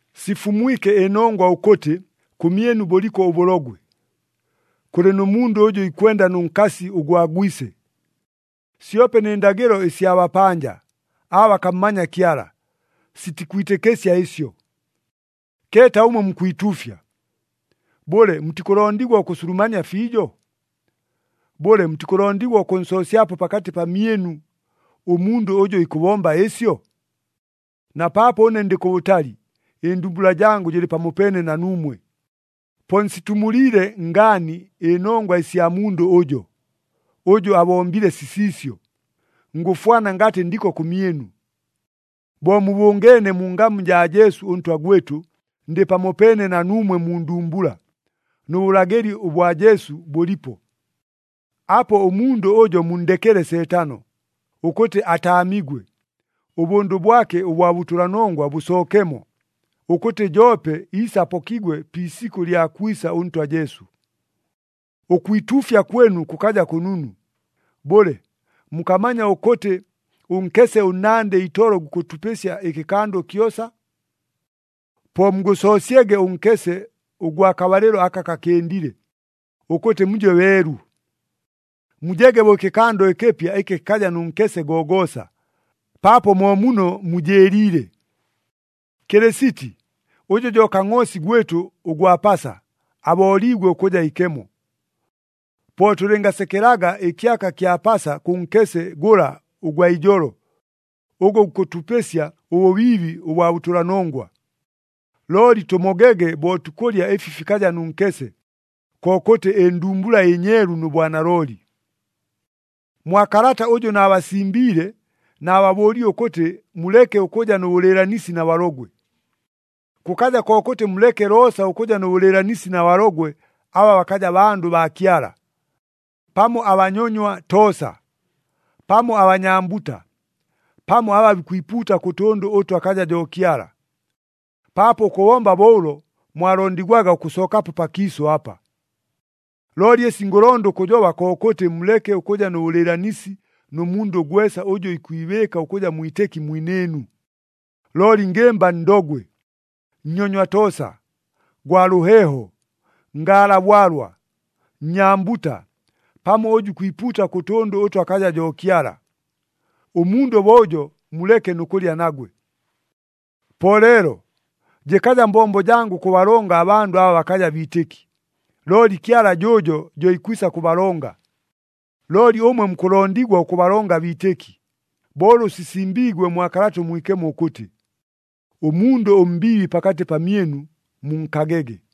Sifumwike ɨnongwa ʉkʉtɨ, kʉmyɨnu bʉliko ʉbʉlogwe. Kʉlɨ nʉ mundʉ ʉjʉ ikwenda nʉ nkasi ʉgwa gwise. Syope nɨ ndagɨlo ɨsya bapanja, aba bakammanya Kyala, sitikwitɨkɨsya ɨsyo! Keeta ʉmwe mukwituufya! Bʉle, mutikʉlondigwa ʉkʉsulumania fiijo? Bʉle, mutikʉlondigwa ʉkʉnsoosyapo pakatɨ pamyɨnu, ʉmundʉ ʉjʉ ikʉbomba ɨsyo? Na paapo ʉne ndɨ kʉbʉtali, ɨndumbula jangʉ jɨlɨ pamopeene na nuumwe. Po nsitumuliile ngaani ɨnongwa ɨsya mundʉ ʉjo, ʉjʉ abombile sisiisyo, ngʉfwana ngatɨ ndiko kʉmyɨnu. Bo mubʉngeene mu ngamu jaa Jesu ʉNtwa gwɨtʉ, ndɨ pamopeene na nuumwe mu ndumbula, nʉ bʉlagɨli ʉbwa Jesu bʉlipo. Apo ʉmundʉ ʉjo munndekele Seetano, ʉkʉtɨ ataamigwe, ʉbʉndʉ bwake ʉbwa bʉtʉlanongwa bʉsookemo, ʉkʉtɨ joope iise apokigwe pi isikʉ lya kwisa ʉNtwa Jesu. Ʉkwituufya kwɨnu kʉkaja kʉnunu. Bʉle, mukamanya ʉkʉtɨ, “Ʉnkese ʉnnandɨ itolo gukʉtupɨsya ɨkɨkando kyosa”? Po mugʉsoosyege ʉnkese ʉgwa kabalɨlo aka kakɨndile, ʉkʉtɨ muje beelu. Mujege bo ɨkɨkando ɨkɨpya ɨkɨ kɨkaja nʉ nkese gogoosa, paapo mo muno mujɨɨliile. Kɨlɨsiti, ʉjʉ jo Kangʼoosi gwɨtʉ ʉgwa Pasa, abooliigwe ʉkʉja ikemo. Po tʉlɨngasekelaga ɨkyaka kya Pasa kʉ nkese gʉla ʉgwa ijolo, ʉgʉ gukʉtupɨsya ʉbʉbiibi ʉbwa bʉtʉlanongwa, looli tʉmogege bo tukʉlya ɨfi fikaja nʉ nkese, kokʉtɨ ɨndumbula ɨnyeelu nʉ bwanalooli. Mwa kalata ʉjʉ naabasimbiile, naababʉʉlile ʉkʉtɨ muleke ʉkʉja nʉ bʉlɨɨlanisi na balogwe. Kʉkaja kokʉtɨ muleke loosa ʉkʉja nʉ bʉlɨɨlanisi na balogwe aba bakaja bandʉ baa Kyala, pamo abanyonywa toosa, pamo abanyambuta, pamo aba bikwipuuta kʉ tʉndʉ ʉtʉ akaja jo Kyala, paapo ʉkʉbomba bo ʉlo mwalondigwaga ʉkʉsookapo pakiisʉ apa! Looli ɨsi ngʉlonda ʉkʉjoba kokʉtɨ muleke ʉkʉja nʉ bʉlɨɨlanisi nʉ mundʉ gwesa ʉjʉ ikwibɨɨka ʉkʉja mwitɨki mwinɨɨnu, looli ngɨmba ndogwe, nnyonywa toosa, gwa lʉheeho, ngaala bwalwa, nnyambuta, pamo ʉjʉ ikwipuuta kʉ tʉndʉ ʉtʉ akaja jo Kyala. Ʉmundʉ bo ʉjo muleke nʉ kʉlya nagwe. Po leelo, jɨkaja mbombo jangʉ ʉkʉbalonga abandʉ aba bakaja biitɨki, looli Kyala jʉʉjo jo ikwisa kʉbalonga. Looli ʉmwe mukʉlondigwa ʉkʉbalonga abiitɨki, bo ʉlʉ sisimbiigwe mwa Kalata ʉMwikemo ʉkʉtɨ, “Ʉmundʉ ʉmbiibi pakatɨ pamyɨnu munkagege.”